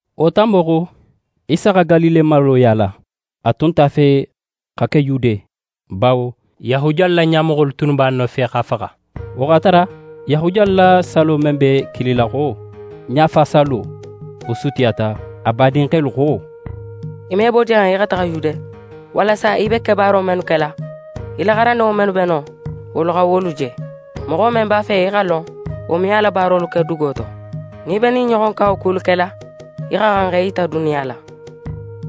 Wo tanbo xo, Isa xa Galile maro yaala. A tun nt'a fe xa ke Yude, bawo Yahudiyalu la ɲamoxolu tunnu b'a nofe x'a faxa. Wo x'a tara Yahudiyalu la sallo men be kilila xo Ɲafasallo, wo sutiyata. A badinxelu xo: «Í me bo jan í xa taxa Yude, walasa í be kebaaro mennu kela, í la xarandinŋo mennu be non, wolu xa wolu je. Moxo men b'a fe í xa lon, wo me a la kebaarolu ke duguwo to. Nin í be ɲin ɲoxon kawakulu kela, í xa xan ne x'é yita duniya la.»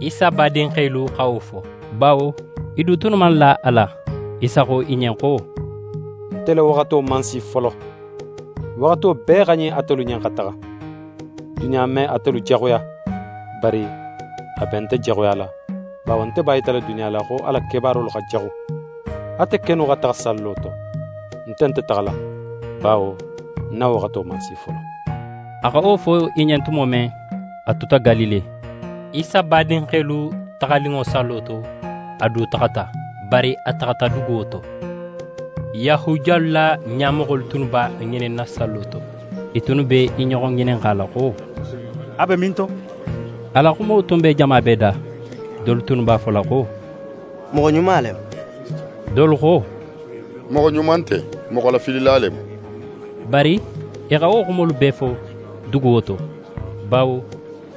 Isa badinxelu xa wo fo, bawo i du tunnu man la a la. Isa xo i ɲen xo: «Nte la waxato man si folo. Waxato bee xa ɲin atelu ɲen, xa taxa. Duniya me atelu jaxuya, bari a be nte jaxuyala, bawo nte b'a yitala duniya la, xo a la kebaarolu xa jaxu. Ate kennu xa taxa sallo to. Nte nte taxala, bawo ń na waxato man si folo.» A xa wo fo i ɲen tumo men, a tuta Galile. Isa badinxelu taxaninŋo sallo to, a du taxata. Bari a taxata duguwo to. Yahudiyalu la ɲamoxolu tunnu b'a ŋininna sallo to. I tunnu be i ɲoxo ŋininxala xo: «A be minto?» A la xumo tun be jama bee da. Dolu tunnu b'a fola xo: «Moxo ɲuma le mu.» Dolu xo: «Moxo ɲuma nte, moxolafilila le mu.» Bari i xa wo xumolu bee fo duguwo to, bawo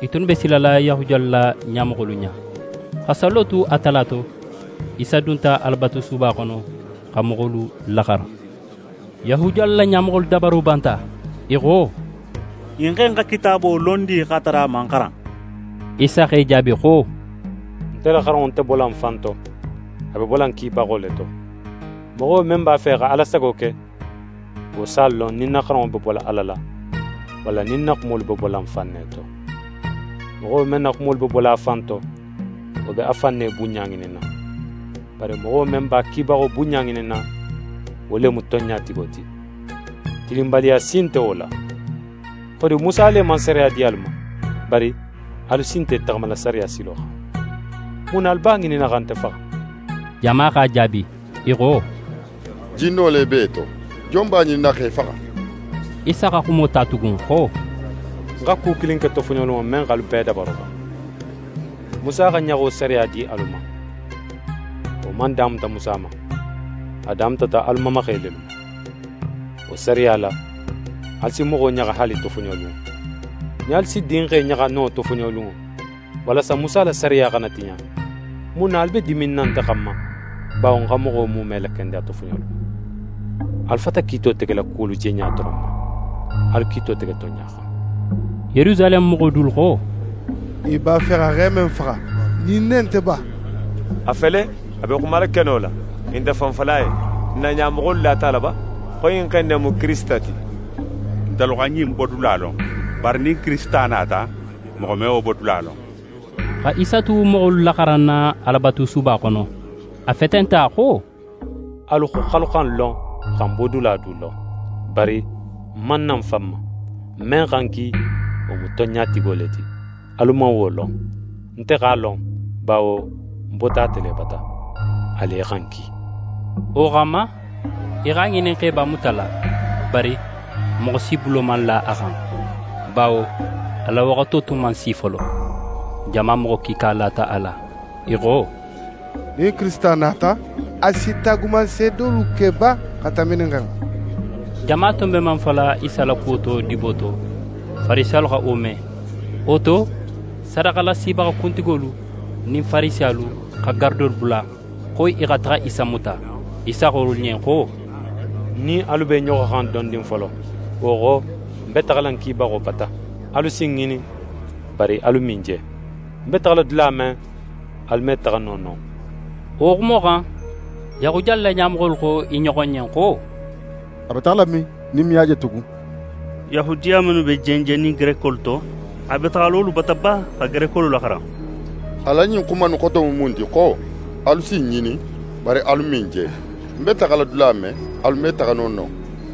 i tunnu be silala Yahudiyalu la ɲamoxolu ɲa. Xa sallo tu a tala to, Isa dunta Alabatusuba xono, xa moxolu laxaran. Yahudiyalu la ɲamoxolu dabaro banta. I xo: «Ɲin xe in xa Kitaabo lon di, x'a tara a man xaran?» Isa x'e jaabi xo: «Nte la xaranŋo nte bola ń fan to. A be bola ń kibaxo le to. Moxo men b'a fe xa Ala sago ke, wo s'a lon nin ń na xaranŋo be bola Ala la, walla nin ń na xumolu be bola ń fan ne to. Moxo men na xumolu be bola a fan to, wo be a fan ne bunɲa ŋininna. Bari moxo men b'a kibaxo bunɲa ŋininna, wo le mu tonɲatigo ti. Tilinbaliya si nte wo la. Xodi, Musa le man sariya di alu ma? Bari alu si nte í taxamala sariya silo xan. Mun na alu b'a ŋininna xa nte faxa?» Jama x'a jaabi, i xo: «Jinno le b'é to! Jon b'a ŋininna x'é faxa?» Isa xa xumo ta tugun xo: «Ń xa ku kilin ke tofoɲolunŋo, men x'alu bee dabaro ban. Musa xa ɲaxo sariya di alu ma. Wo man damuta Musa ma, a damutata alu mamaxe lelu ma. Wo sariya la, alu si moxo ɲaxa haali tofoɲolunŋo. Nin alu si dinxe ɲaxa no tofoɲolunŋo, walasa Musa la sariya xana tiɲa, mun na alu be diminna nte xanma, bawo ń xa moxo muume lakendeya tofoɲolunŋo? Alu fata kiito tegela kuwolu jeɲa doron ma. Alu kiito tege tonɲa xan.» Yerusaleme moxo dolu xo: «I b'a fe xa xe men faxa, ɲin ne nte ba? A fele, a be xumala keno la, i nte fen fola a ɲen. N na ɲamoxolu lata a la ba, xo ɲin xe in ne mu Kirisita ti? Ntelu xa ɲin bodula lon. Bari nin Kirisita nata, moxo me wo bodula lon.» Xa Isa tu moxolu laxaranna Alabatusuba xono, a fetenta xo: «Alu xo, x'alu xa ń lon, xa ń bodula du lon. Bari ń man na ń fan ma. Men xa ń ki, wo mu tonɲatigo le ti. Alu man wo lon. Nte x'a lon, bawo ń bota ate le bata. A le xa ń ki.» Wo xanma, i x'a ŋinin x'e b'a mutala. Bari moxo si bulo man la a xan, bawo a la waxato tun man si folo. Jama moxo kiika lata a la. I xo: «Nin Kirisita nata, a si taagumanseedolu ke ba xa tanbi ɲin xan?» Jama tun be men fola Isa la kuwo to dibo to, Farisiyalu xa wo me. Wo to, sadaxalasibaxa kuntigolu nin Farisiyalu xa garadolu bula, xo i xa taxa Isa muta. Isa xo wolu ɲen xo: «Ń nin alu be i ɲoxo xan dondin folo. Wo xo, ń be taxala ń kibaxo bata. Alu si ń ŋinin, bari alu me ń je. Ń be taxala dula men, alu me taxa no non.» Wo xumo xan, Yahudiyalu la ɲamoxolu xo i ɲoxo ɲen xo: «A be taxala min, nin n me a je tugun? Yahudiya mennu be jenjennin Gerekolu to, a be taxala wolu bata ba, xa Gerekolu laxaran? A la ɲin xuma innu xoto mu mun ti xo: Alu si ń ŋinin, bari alu me ń je. Ń be taxala dula men, alu me taxa no non?»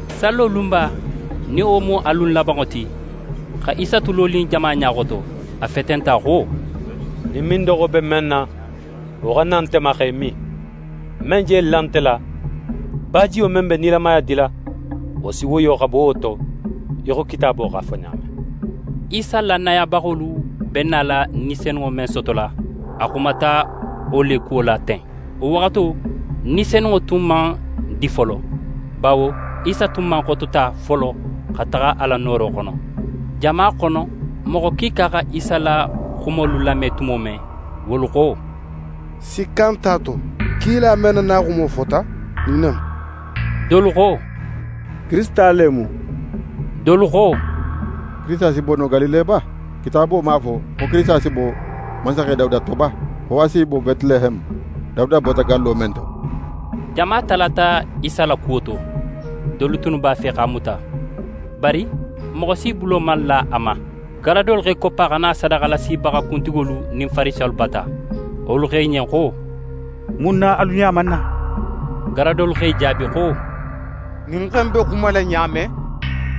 Sallo lunba, nin wo mu a lun labanŋo ti, xa Isa tu lonin jama ɲa xoto, a fetenta xo: «Nin mindoxo be men na, wo xa na nte ma x'é min. Men je la nte la, bajiyo men be nilamaya dila, wo si woyo xa bo wo to, í xo Kitaabo x'a fo ɲa men.» Isa lannayabaxolu be nala Ni Senunŋo men sotola, a xumata wo le kuwo la ten. Wo waxato, Ni Senunŋo tun man di folo, bawo Isa tun man xotota folo xa taxa a la nooro xono. Jama xono, moxo kiika xa Isa la xumolu lame tumo men, wolu xo: «Sikka nt'a to kila men na naxumo fota, ɲin ne mu.» Dolu xo: «Kirisita le mu.» Dolu xo: «Kirisita si bo no Galile ba? Kitaabo man a fo xo Kirisita si bo mansaxe Dawuda to ba? Xo a si bo Betileheme, Dawuda bota gallo men to?» Jama talata Isa la kuwo to. Dolu tunnu b'a fe x'a muta. Bari moxo si bulo man la a ma. Garadolu x'e koppa xa na sadaxalasibaxa kuntigolu nin Farisiyalu bata. Wolu xo i ɲen xo: «Mun na alu nin a man na?» Garadolu x'e jaabi xo: «Ɲin xe in be xumala ɲa men,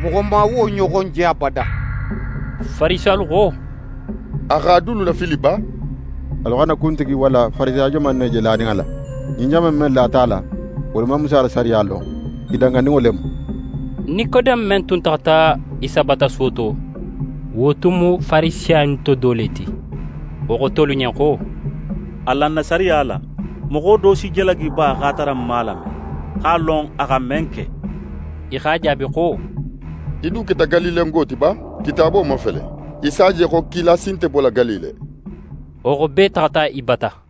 moxo man wo ɲoxon je abada.» Farisiyalu xo: «A x'alu dulu lafili ba? Alu xa n na kuntigi walla Farisiya joman kilin ne je lanin a la? Ɲin jama in men lata a la, wolu man Musa la sariya lon. I danganinŋo le mu.» Nikodeme men tun taxata Isa bata suwo to, wo tun mu Farisiya innu to do le ti. Wo xo tolu ɲen xo: «Alan na sariya la, moxo do si jalagi ba, x'a tara n man a lame, x'a lon a xa men ke?» I x'a jaabi xo: «Í du keta Galilengo ti ba? Kitaabo mafele, í s'a je xo kila si nte bola Galile.» [ Wo xo, bee taxata í bata.